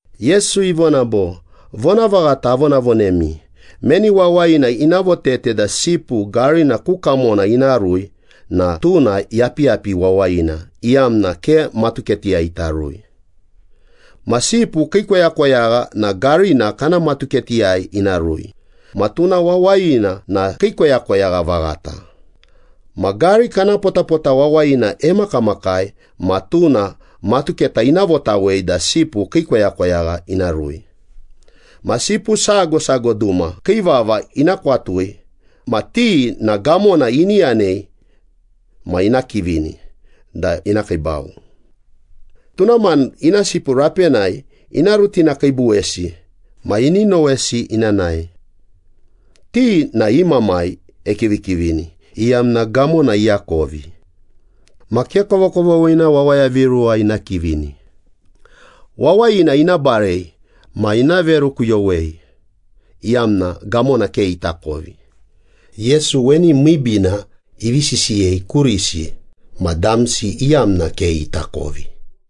Yesu ivona bo, “Vonavaghata avonavonemi, meni wawayina ina votete da sipu garina ku kamona ina rui na tuna yapiyapi wawayina, iyamna ke matuketiyai ita rui. Ma sipu kii koyakoyagha na garina kana matuketiyai ina rui, ma tuna wawayina na kii koyakoyagha vaghata. Ma gari kana potapota wawayina emakamakai ma tuna matuketa ina votawei da sipu kii koyakoyagha ina rui. Ma sipu sago sago duma kii vava ina kwatui ma ti na gamona ini yanei ma ina kivini da ina kiibau. Tuna mani ina sipu rapenai ina rutinakiibuwesi ma ini nowesi ina nae. Ti na i mamai ekivikivini, iyamna gamona iakovi. Ma ke kovokovoghina wawaya viruwa ina kivini. Wawayina ina barei ma ina verukuyowei, iyamna gamona ke itakovi.” Yesu weni miibiina ivi sisiyei kurisi ma damsi iyamna ke itakovi.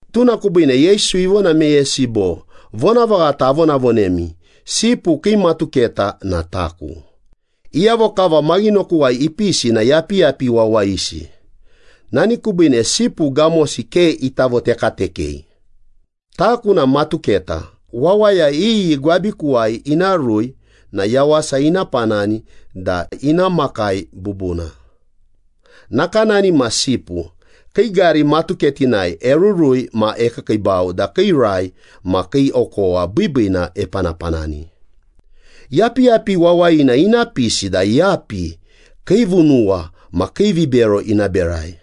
Tuna kubiine Yesu ivona meyesi bo, “Vonavaghata avonavonemi, sipu kii matuketa na taku. Iyavo kava maghinokuwai ipisi na yapiyapi wawayisi, nani kubiine sipu gamosi ke ita votekatekei. Taku na matuketa. Wawaya iyi gwabikuwai ina rui na yawasa ina panani da ina makai bubuna. Nakanani ma sipu, kii gari matuketinai erurui ma ekiikiibau da kii rai ma kii okowa biibiina epanapanani. Yapiyapi wawayina ina pisi da yapi, kiivunuwa ma kiivibero ina berai.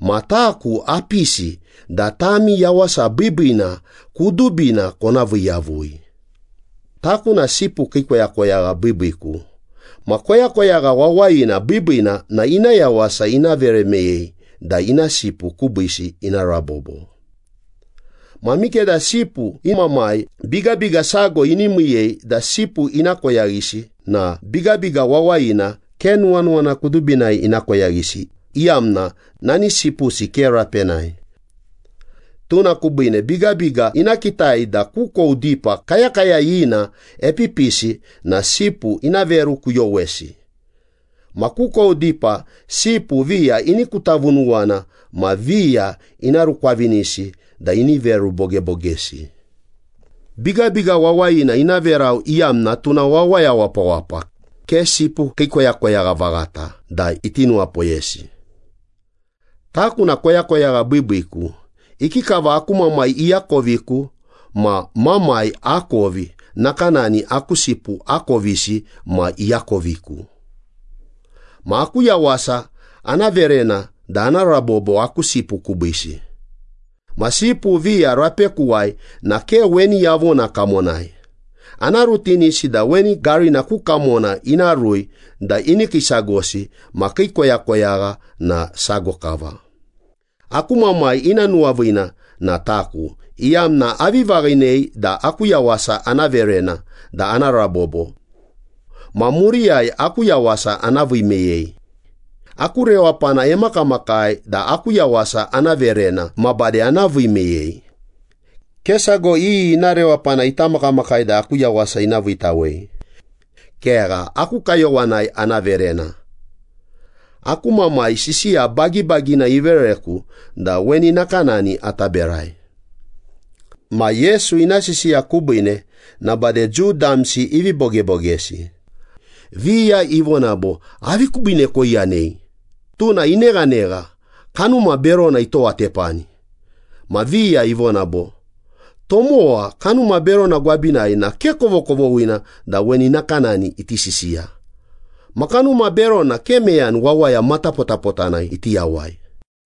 Ma taku apisi da tami yawasa biibiina kudubina kona vii yavui.” “Taku na sipu kii koyakoyagha biibiiku. Ma koyakoyagha wawayina biibiina na ina yawasa ina vere meyei da ina sipu kubiisi ina rabobo. Ma mikeda sipu i mamai bigabiga sago ini miiyei da sipu ina koyaghisi na bigabiga wawayina ke nuwanuwana kudubinai ina koyaghisi, iyamna nani sipusi ke rapenai. Tuna kubiine bigabiga ina kitai da kukou dipa kayakayayina epipisi na sipu ina verukuyowesi. Ma kukou dipa sipu viya ini kutavunuwana ma viya ina rukwavinisi da ini verubogebogesi. Bigabiga wawayina ina verau, iyamna tuna wawaya wapawapa, ke sipu kii koyakoyagha vaghata da iti nuwapoyesi. Taku na koyakoyagha biibiiku. Ikikava aku Mamai iakoviku ma Mamai akovi, nakanani aku sipu akovisi ma iakoviku. Ma aku yawasa ana verena da ana rabobo aku sipu kubiisi. Ma sipu viya rapekuwai na ke weni yavona kamonai. Ana rutinisi da weni garina ku kamona ina rui da ini kiisagosi ma kii koyakoyagha na sago kava.” “Aku Mamai ina nuwaviina na taku, iyamna avi vaghinei da aku yawasa ana verena da ana rabobo. Ma muriyai aku yawasa ana vii meyei. Aku rewapana emakamakai da aku yawasa ana verena ma bade ana vii meyei. Ke sago iyi ina rewapana ita makamakai da aku yawasa ina viitawei. Kegha, aku kayowanai ana verena. Aku Mamai sisiya bagibagina ivereku da weni nakanani ata berai.” Ma Yesu ina sisiya kubiine na bade Jiu damsi ivi bogebogesi. Viya ivona bo, “Avi kubiine koiyanei? Tuna ineghanegha, kanuma berona itowatepani.” Ma viya ivona bo, “Tomowa kanuma berona gwabinai na ke kovokovoghina da weni nakanani iti sisiya. Ma kanuma berona ke meyani wawaya matapotapotana iti yawai.”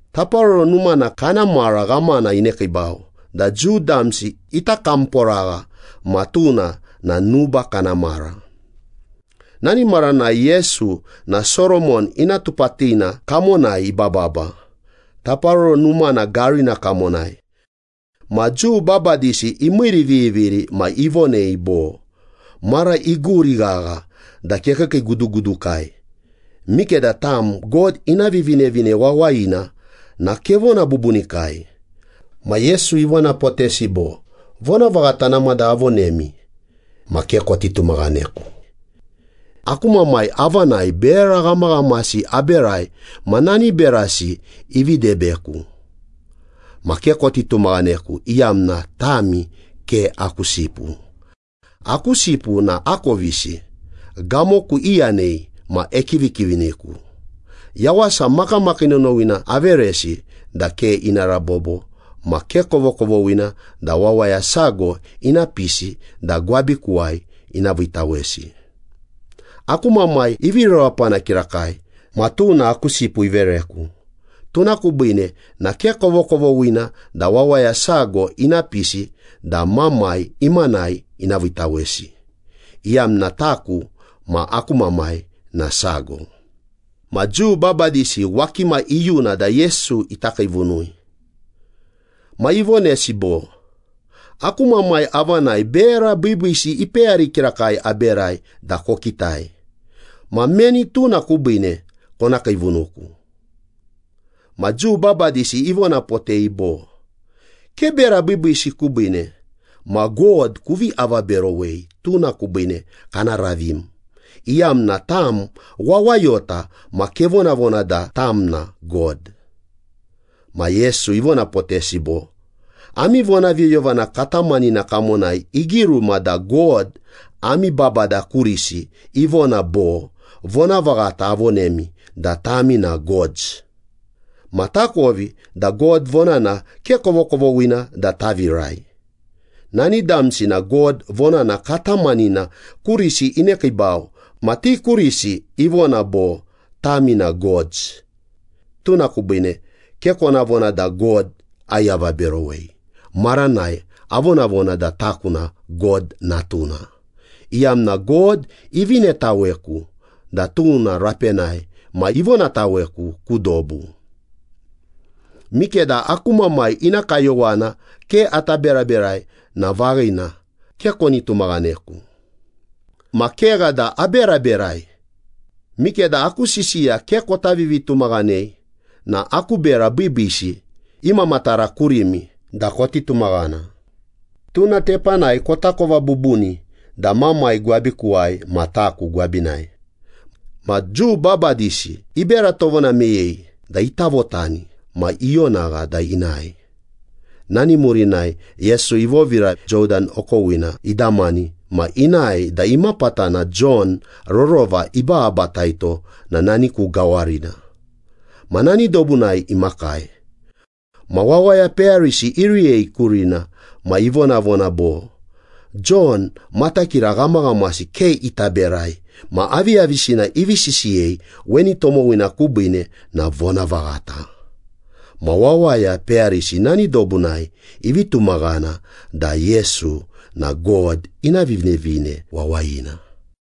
Taparoro Numana kana mara ghamana inekiibau da Jiu damsi ita kamporagha ma tuna na nuba kana mara. Nani maranai Yesu na Soromon Ina Tupatina kamonai ibababa, Taparoro Numana garina kamonai. Ma Jiu babadisi imiiriviviri ma ivonei bo, “Mara iguri ghagha da kekiikiigudugudukai. Mikeda tam God ina Vivinevine Wawayina na kevona bubunikai.” Ma Yesu ivonapotesi bo, “Vonavaghata namada avonemi ma ke koti tumaghaneku. Aku Mamai avanai bera ghamaghamasi aberai, ma nani berasi ivi debeku. Ma ke koti tumaghaneku, iyamna tami ke aku sipu. Aku sipu na akovisi. Gamoku iyanei ma ekivikiviniku. Yawasa makamakii nonowina averesi da ke ina rabobo, ma ke kovokovoghina da wawaya sago ina pisi da gwabikuwai ina viitawesi. Aku Mamai ivi rewapana kirakai ma tuna aku sipu ivereku. Tuna kubiine na ke kovokovoghina da wawaya sago ina pisi da Mamai imanai ina viitawesi, iyamna taku ma aku Mamai na sago.” Ma Jiu babadisi wakima iyuna da Yesu ita kiivunui. Ma ivonesi bo, “Aku Mamai avanai bera biibiisi ipeyari kirakai aberai da kokitai. Ma meni tuna kubiine kona kiivunuku?” Ma Jiu babadisi ivonapotei bo, “Ke bera biibiisi kubiine. Ma God kuvi avaberowei, tuna kubiine kana ravim, iyamna tam wawayota ma kevonavona da tam na God.” Ma Yesu ivonapotesi bo, “Ami vonaviyoyovana katamanina kamonai igiruma da God ami babada kurisi ivona bo, ‘Vonavaghata avonemi da tami na gods.’ Ma takovi da God vonana ke kovokovoghina da tavirai. Nani damsi na God vonana katamanina kurisi inekiibau ma ti kurisi ivona bo, ‘Tami na gods.’ Tuna kubiine ke kona vona da God aiavaberowei maranai avonavona da taku na God Natuna, iyamna God ivinetaweku da tuna rapenai ma ivonataweku ku dobu. Mikeda aku Mamai ina kayowana ke ata beraberai na vaghina, ke koni tumaghaneku. Ma kegha da aberaberai. Mikeda aku sisiya ke kota vivitumaghanei na aku bera biibiisi imamatara kurimi da koti tumaghana. Tuna tepanai kotakova bubuni da Mamai gwabikuwai ma taku gwabinai.” Ma Jiu babadisi ibera tovona meyei da ita votani ma ionagha da inae. Nani murinai Yesu ivovira Jodan okowina idamani ma inae da imapatana Jon rorova ibababataito na nani ku gawarina. Ma nani dobunai imakai. Ma wawaya peyarisi iriyei kurina, ma ivonavona bo, “Jon matakira ghamaghamasi ke ita berai ma aviyavisina ivi sisiyei weni tomowina kubiine na vonavaghata.” Ma wawaya peyarisi nani dobunai ivi tumaghana da Yesu na God ina Vivinevine Wawayina.